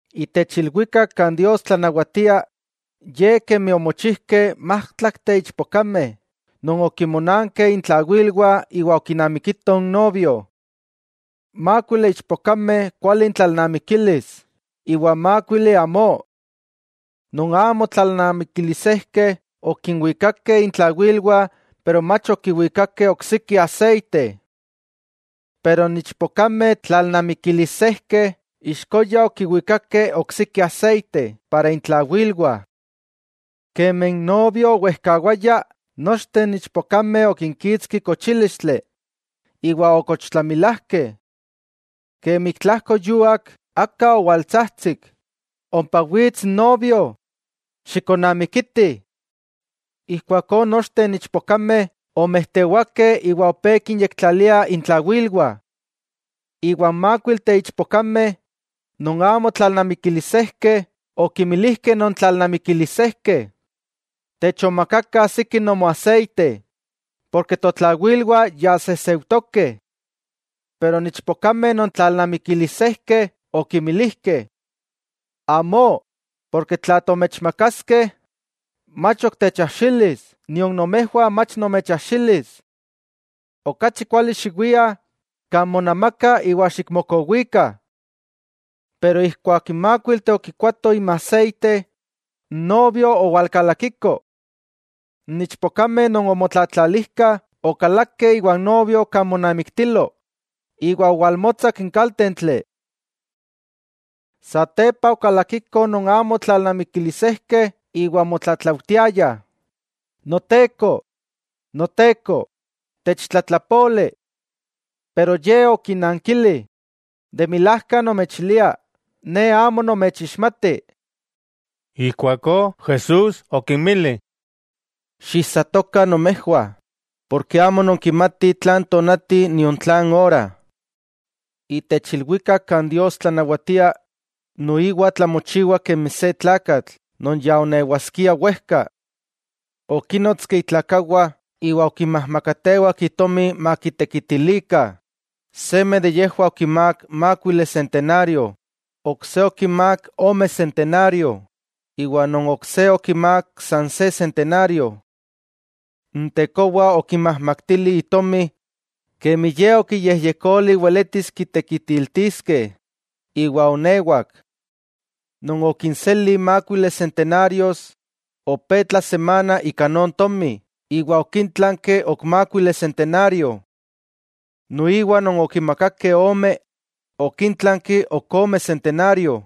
'Itech ilwikak kan Dios tlanawatia, ye kemi omochijkeh májtlakteh ichpokameh non okinmonankeh intlawilwah iwa okinamikitoh n novio. Mákuili ichpokameh kuali intlalnamikilis iwa mákuili amó. Non amo tlalnamikilisejkeh, okinwikakeh intlawilwah pero mach okiwikakeh oksiki aseite. Pero n ichpokameh tlalnamikilisejkeh, ixkoya okiwikakeh oksiki aseite para intlawilwah. Kemi n novio owejkawaya, nochteh n ichpokameh okinkitski kochílistli, iwa okochtlamilajkeh. Kemi ik tlajkoyuak aka owaltsajtsik: “¡Ompa wits n novio, xikonnamikitih!” Ijkuakó nochteh n ichpokameh omejtewakeh iwa opé kinyektlaliah intlawilwah. Iwa n mákuilteh ichpokameh non amo tlalnamikilisejkeh okinmilijkeh non tlalnamikilisejkeh: “Techonmakakah siki nomoaseite, porke totlawilwah ya sejseujtokeh.” Pero n ichpokameh non tlalnamikilisejkeh okinmilijkeh: “Amó, porke tla tomechmakaskeh, mach ok techajxilis nion nomejwah mach nomechajxilis. Okachi kuali xiwiah kan monamaka iwa xikmokowikah.” Pero ijkuak n mákuilteh okikoatoh inmaseite, n novio owalkalakiko. N ichpokameh non omotlatlalijkah okalakeh iwa n novio kan monamiktilo iwa owalmotsak n kaltentli. Satepa okalakikoh non amo tlalnamikilisejkeh iwa omotlatlautiayah: “¡Noteko, Noteko, techtlatlapoli!” Pero ye okinnankili: “De milajka nomechilia, ne amo nomechixmati.” Ijkuakó Jesús okinmili: —Xiijsatokah nomejwah, porke amo nonkimatih tlan tonati nion tlan ora niajsiti. 'Itech ilwikak kan Dios tlanawatia, noiwa tlamochiwa kemi se tlakatl non ya onewaskia wejka. Okínnotski itlakawah iwa okinmajmakatewak itomi makitekitilikah. 'Seme de yejwah okimák mákuili sentenario, ok se okimák ome sentenario, iwa non ok se okimák san se sentenario. N tekowa okinmajmaktili itomi kemi ye okiyejyekoli weletis kitekitiltiskeh, iwa oonewak. Non okinseli mákuili sentenarios, opé tlasemana ika non tomi iwa okíntlanki ok mákuili sentenario. Noiwa non okimakakeh ome, okíntlanki ok ome sentenario.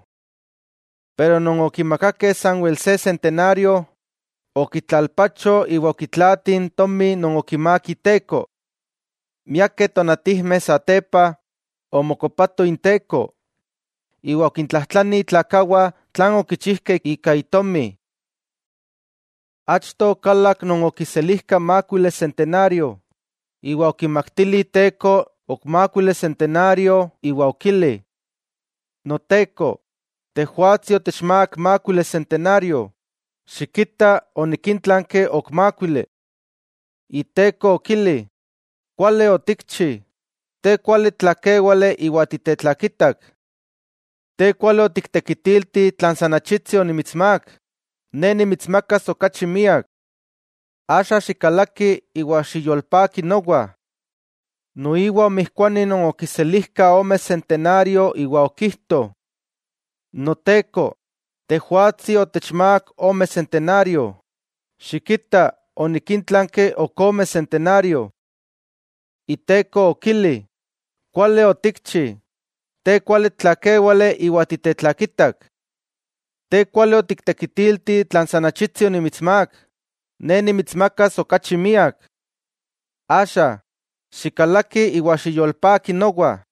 Pero non okimakakeh sanwel se sentenario, okitlalpacho iwa okitlaati n tomi non okimák iteko. 'Miakeh tonatijmeh satepa, omokopato inteko, iwa okintlajtlani itlakawah tlan okichijkeh ika itomi. Achto okalak non okiselijka mákuili sentenario, iwa okimaktili iteko ok mákuili sentenario iwa okili: “Noteko, tejwatsi otechmák mákuili sentenario, xikita onikíntlanki ok mákuili.” Iteko okili: “Kuali otikchi, te kuali tlakéwale iwa titetlakitak. Te kuali otiktekitilti tlan san achitsi onimitsmák, ne nimitsmakas okachi miak. Axa, xikalaki iwa xiyolpaki nowa.” Noiwa omijkuani non okiselijka ome sentenario iwa okijto: “Noteko, tejwatsi otechmák ome sentenario, xikita onikíntlanki ok ome sentenario.” Iteko okili: “Kuali otikchi, te kuali tlakéwale iwa titetlakitak. Te kuali otiktekitilti tlan san achitsi onimitsmák, ne nimitsmakas okachi miak. Axa, xikalaki iwa xiyolpaki nowa.”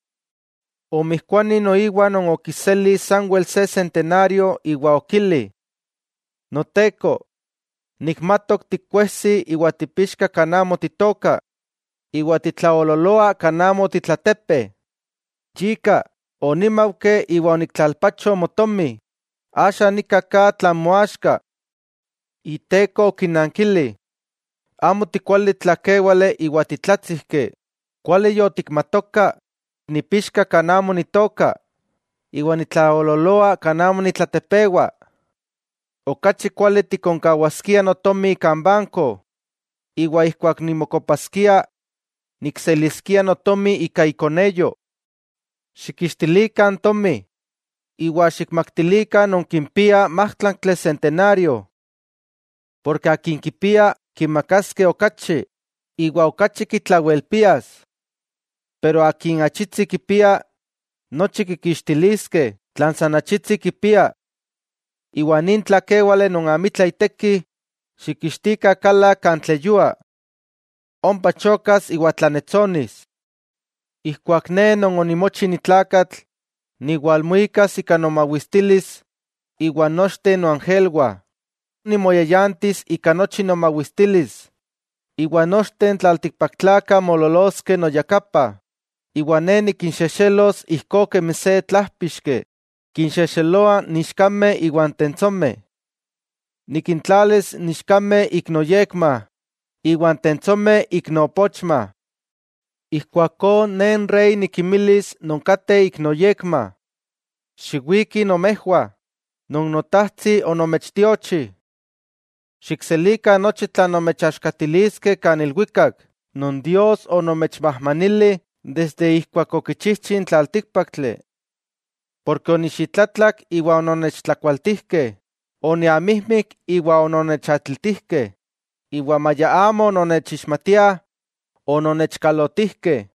Omijkuani noiwa non okiseli sanwel se sentenario, iwa okili: “Noteko, nikmatok tikuejsi iwa tipixka kan amo titooka, iwa titlaoololoa kan amo otitlatepe. Yika, onímaujki iwa oniktlalpacho motomi. Axa nika ka tlan moaxka.” Iteko okinankili: “Amo tikuali tlakéwale iwa titlátsijki, kuali yotikmatoka nipixka kan amo nitooka, iwa nitlaoololoa kan amo nitlatepewa. Okachi kuali tikonkawaskia notomi kan banko, iwa ijkuak nimokopaskia, nikseliskia notomi ika ikoneyo. Xikkixtilikah n tomi, iwa xikmaktilikah non kimpia májtlaktli sentenario.” Porke akin kipia, kimakaskeh okachi, iwa okachi kitlawelpias. Pero akin achitsi kipia, nochi kikixtiliskeh tlan san achitsi kipia. Iwa nin tlakéwale non amitla iteki, xikixtikah kala kan tleyua. Ompa chokas iwa tlannetsonis. 'Ijkuak Ne Non onimochi ni tlakatl niwalmuikas ika nomawistilis iwan nochteh noangelwah, ijkuakó nimoyayantis ika nochi nomawistilis. Iwa nochteh n tlaltikpaktlakah moololoskeh noyakapa, iwa Ne nikinxexelos ijkó kemi se tlájpixki kinxexeloa n ichkameh iwa n tentsomeh. Nikintlalis n ichkameh ik noyekma iwa n tentsomeh ik noopochma. Ijkuakó Ne n Rey nikinmilis non kateh ik noyekma: “Xiwikih nomejwah, non Notajtsi onomechtiochi. Xikselikah nochi tlan nomechaxkatiliskeh kan ilwikak non Dios onomechmajmanili desde ijkuak okichijchi n tlaltíkpaktli. Porke onixitlatlak iwa ononnechtlakualtijkeh, oniamijmik iwa ononnechatlitijkeh, iwa maya amo ononnechixmatiah, ononnechkalotijkeh.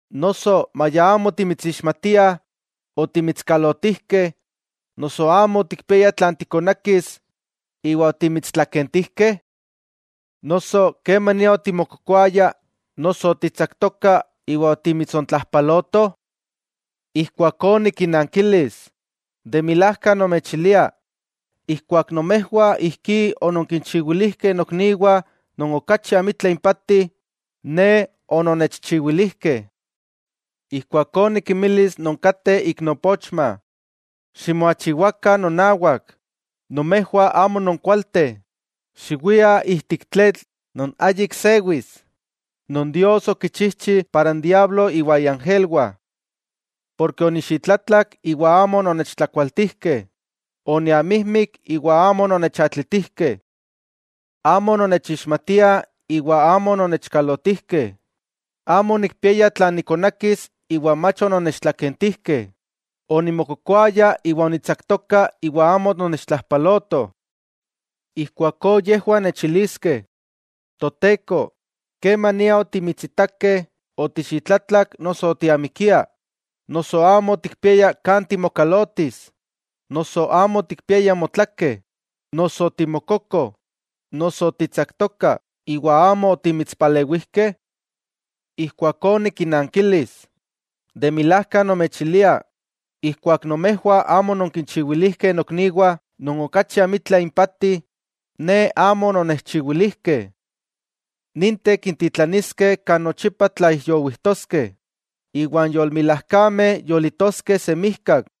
Noso ¿maya amo otimitsixmatiah, otimitskalotijkeh, noso amo otikpiaya tlan tikonakis iwa otimitstlakentijkeh? Noso, ¿kemania otimokokoaya, noso otitsaktoka iwa otimitsontlajpalotoh?” Ijkuakó nikinnankilis: “De milajka nomechilia, ijkuak nomejwah ijkí ononkinchiwilijkeh nokniwah non okachi amitla impati, Ne ononnechchiwilijkeh.” 'Ijkuakó nikinmilis non kateh ik noopochma: “Ximoachiwakah nonawak, nomejwah amo nonkualteh, xiwiah ijtik tletl non ayik sewis, non Dios okichijchi para n diablo iwa iangelwah. Porke onixitlatlak iwa amo ononnechtlakualtijkeh, oniamijmik iwa amo ononnechatlitijkeh. Amo ononnechixmatiah iwa amo ononnechkalotijkeh, amo onikpiaya tlan nikonakis iwa mach ononnechtlakentijkeh, onimokokoaya iwa onitsaktoka iwa amo ononnechtlajpalotoh.” Ijkuakó yejwah nechiliskeh: “Toteko, ¿kemania otimitsitakeh otixitlatlak noso otiamikia, noso amo otikpiaya kan timokalotis, noso amo otikpiaya motlake, noso otimokoko, noso otitsaktoka iwa amo otimitspalewijkeh?” Ijkuakó nikinnankilis: “De milajka nomechilia, ijkuak nomejwah amo ononkinchiwilijkeh nokniwah non okachi amitla impati, Ne amo ononnechchiwilijkeh.” 'Ninteh kintitlaniskeh kan nochipa tlaijyowijtoskeh, iwa n yolmilajkameh yolitoskeh semijkak.